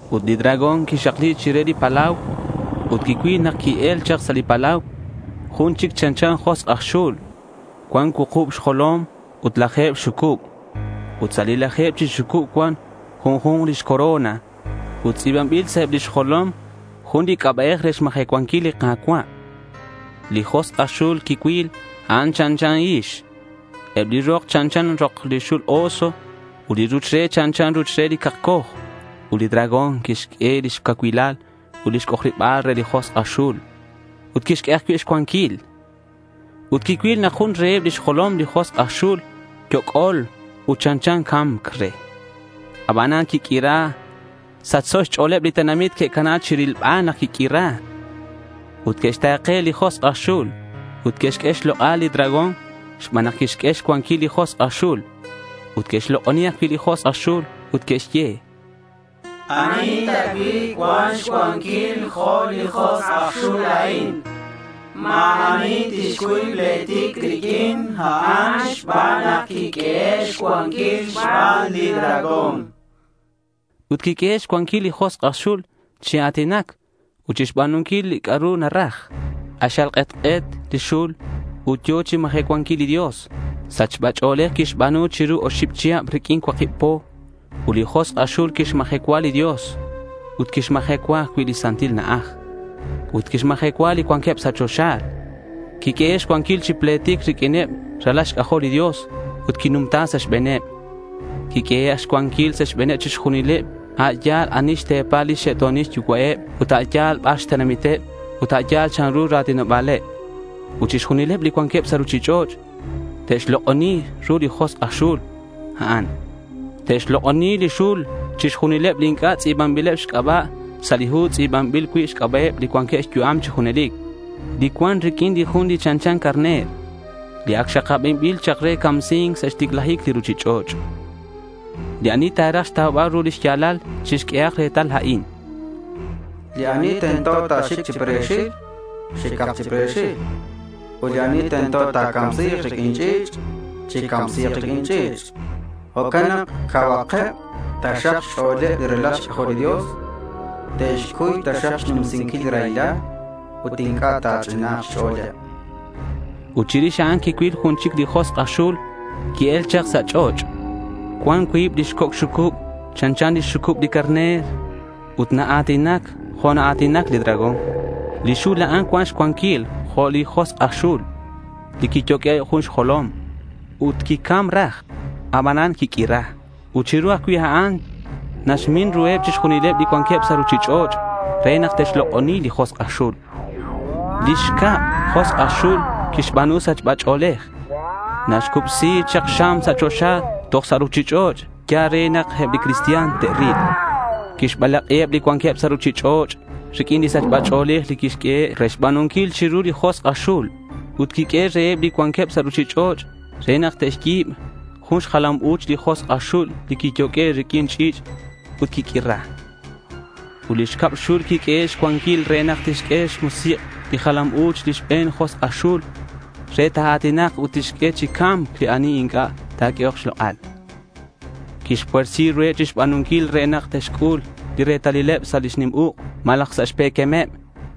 Ut li dragón quixakli chire li palau ut quicuil nak qui-el chak sa' li palau jun chic chanchan josk' aj xul cuan cuukub xjolom ut laje̱b lix xucub. Ut sa' li laje̱b chi xucub cuan junju̱nk lix corona. Ut tz'i̱banbil sa' eb lix jolom jun li c'aba'ej re xmajecuanquil li Ka̱cua'. Li josk' aj xul li quicuil, a'an chanchan hix. Eb li rok chanchan rok li xul oso. Ut li ruch re chanchan ruch re li cakcoj. Ut li dragón quixq'ue lix cacuilal ut lix c'ojariba̱l re li josk' aj xul. Ut quixq'ue ajcui' xcuanquil. Ut quicuil nak jun reheb lix jolom li josk' aj xul yoc'ol ut chanchan ca̱mc re. Abanan quiq'uira. Sachso xch'o̱leb li tenamit que'cana chirilbal nak quiq'uira. Ut que'xta̱ke li josk' aj xul. Ut que'xq'ue xlok'al li dragón xban nak quixq'ue xcuanquil li josk' aj xul. Ut que'xlok'oni ajcui' li josk' aj xul ut que'xye: —¿Ani ta cui' cuan xcuanquil jo' li josk' aj xul a'in? Ma̱ ani tixcuy pletic riq'uin a'an xban nak quiq'uehe' xcuanquil xban li dragón, chanqueb. Ut quiq'uehe' xcuanquil li josk' aj xul chi a̱tinac ut chixba̱nunquil li c'a'ru ta̱raj. K'axal k'etk'et li xul ut yo̱ chixmajecuanquil li Dios. Sachba ch'o̱lej quixba̱nu chiru oxib chihab riq'uin cuakib po. Ut li josk' aj xul quixmajecua li Dios ut quixmajecua ajcui' lix santil na'aj. Ut quixmajecua li cuanqueb sa' choxa. Quiq'uehe' xcuanquil chi pletic riq'uineb li ralal xc'ajol li Dios ut quinumta sa' xbe̱neb. Quiq'uehe' xcuanquil sa' xbe̱neb chixjunileb, a' yal ani xte̱paleb lix xe'to̱nil yucua'eb, ut a' yal bar xtenamiteb ut a' yal chanru li ra̱tinoba̱leb. Ut chixjunileb li cuanqueb sa' ruchich'och' te'xlok'oni ru li josk' aj xul a'an. Te'xlok'oni li xul chixjunileb li inc'a' tz'i̱banbileb xc'aba' sa' li hu li tz'i̱banbil cui' xc'aba'eb li cuanqueb xyu'am chi junelic, li cuan riq'uin li Jun li chanchan carner, li ac xakabanbil chak re camsi̱c sa' xticlajic li ruchich'och'. Li ani ta̱raj xtaubal ru li xya̱lal, chixq'uehak retal a'in: Li ani tento ta̱xic chi pre̱xil, xicak chi pre̱xil. Ut li ani tento ta̱camsi̱k riq'uin ch'i̱ch', chicamsi̱k riq'uin ch'i̱ch'. Jo'can nak cauhakeb taxak xch'o̱leb li ralal xc'ajol li Dios. Te'xcuy taxak xnumsinquil li raylal ut inc'a' ta chich'ina̱nk xch'o̱leb. Ut chirix a'an quicuil jun chic li josk' aj xul qui-el chak sa' ch'och'. Cuan cuib lix coc' xucub chanchan lix xucub li carner. Ut naa̱tinac jo' naa̱tinac li dragón. Li xul a'an cuan xcuanquil jo' li josk' aj xul li quiyoq'ue' jun xjolom ut quicam raj abanan quiq'uira. Ut chiru ajcui' a'an naxmin ruheb chixjunileb li cuanqueb sa' ruchich'och' re nak te'xlok'oni li josk' aj xul. Li xcab josk' aj xul quixba̱nu sachba ch'o̱lej. Naxcubsi chak xam sa' choxa toj sa' ruchich'och' yal re nak eb li cristian te'ril. Quixbalak'iheb li cuanqueb sa' ruchich'och' riq'uin li sachba ch'o̱lej li quiq'uehe' re xba̱nunquil chiru li josk' aj xul. Ut quixye reheb li cuanqueb sa' ruchich'och' nak te'xyi̱b jun xjalam u̱ch li josk' aj xul li quiyoq'ue' riq'uin ch'i̱ch' ut quiq'uira. Ut li xcab xul quiq'uehe' xcuanquil re nak tixq'ue xmusik' lix jalam u̱ch li xbe̱n josk' aj xul re ta̱a̱tinak ut tixq'ue chi ca̱mc li ani inc'a' ta̱q'uehok xlok'al. Quixpuersi ruheb chixjunileb re nak te'xc'ul li retalileb sa' lix nim uk' malaj sa' xpe̱quemeb.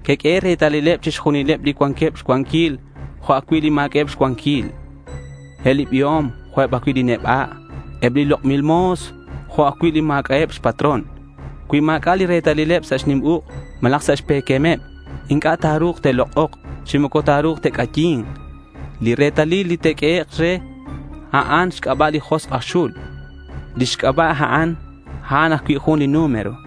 Que'q'uehe' retalileb chixjunileb li cuanqueb xcuanquil jo' ajcui' li ma̱c'a'eb xcuanquil, eb li biom jo' eb ajcui' li neba', eb li lok'bil mo̱s jo' ajcui' li ma̱c'a'eb xpatrón. Cui ma̱c'a' li retalileb sa' xnim uk' malaj sa' xpe̱quemeb, inc'a' ta̱ru̱k te'lok'ok chi moco ta̱ru̱k te'c'ayi̱nk. Li retalil li te'q'uehek', a'an xc'aba' li josk' aj xul. Lix c'aba' a'an, a'an ajcui' jun li número.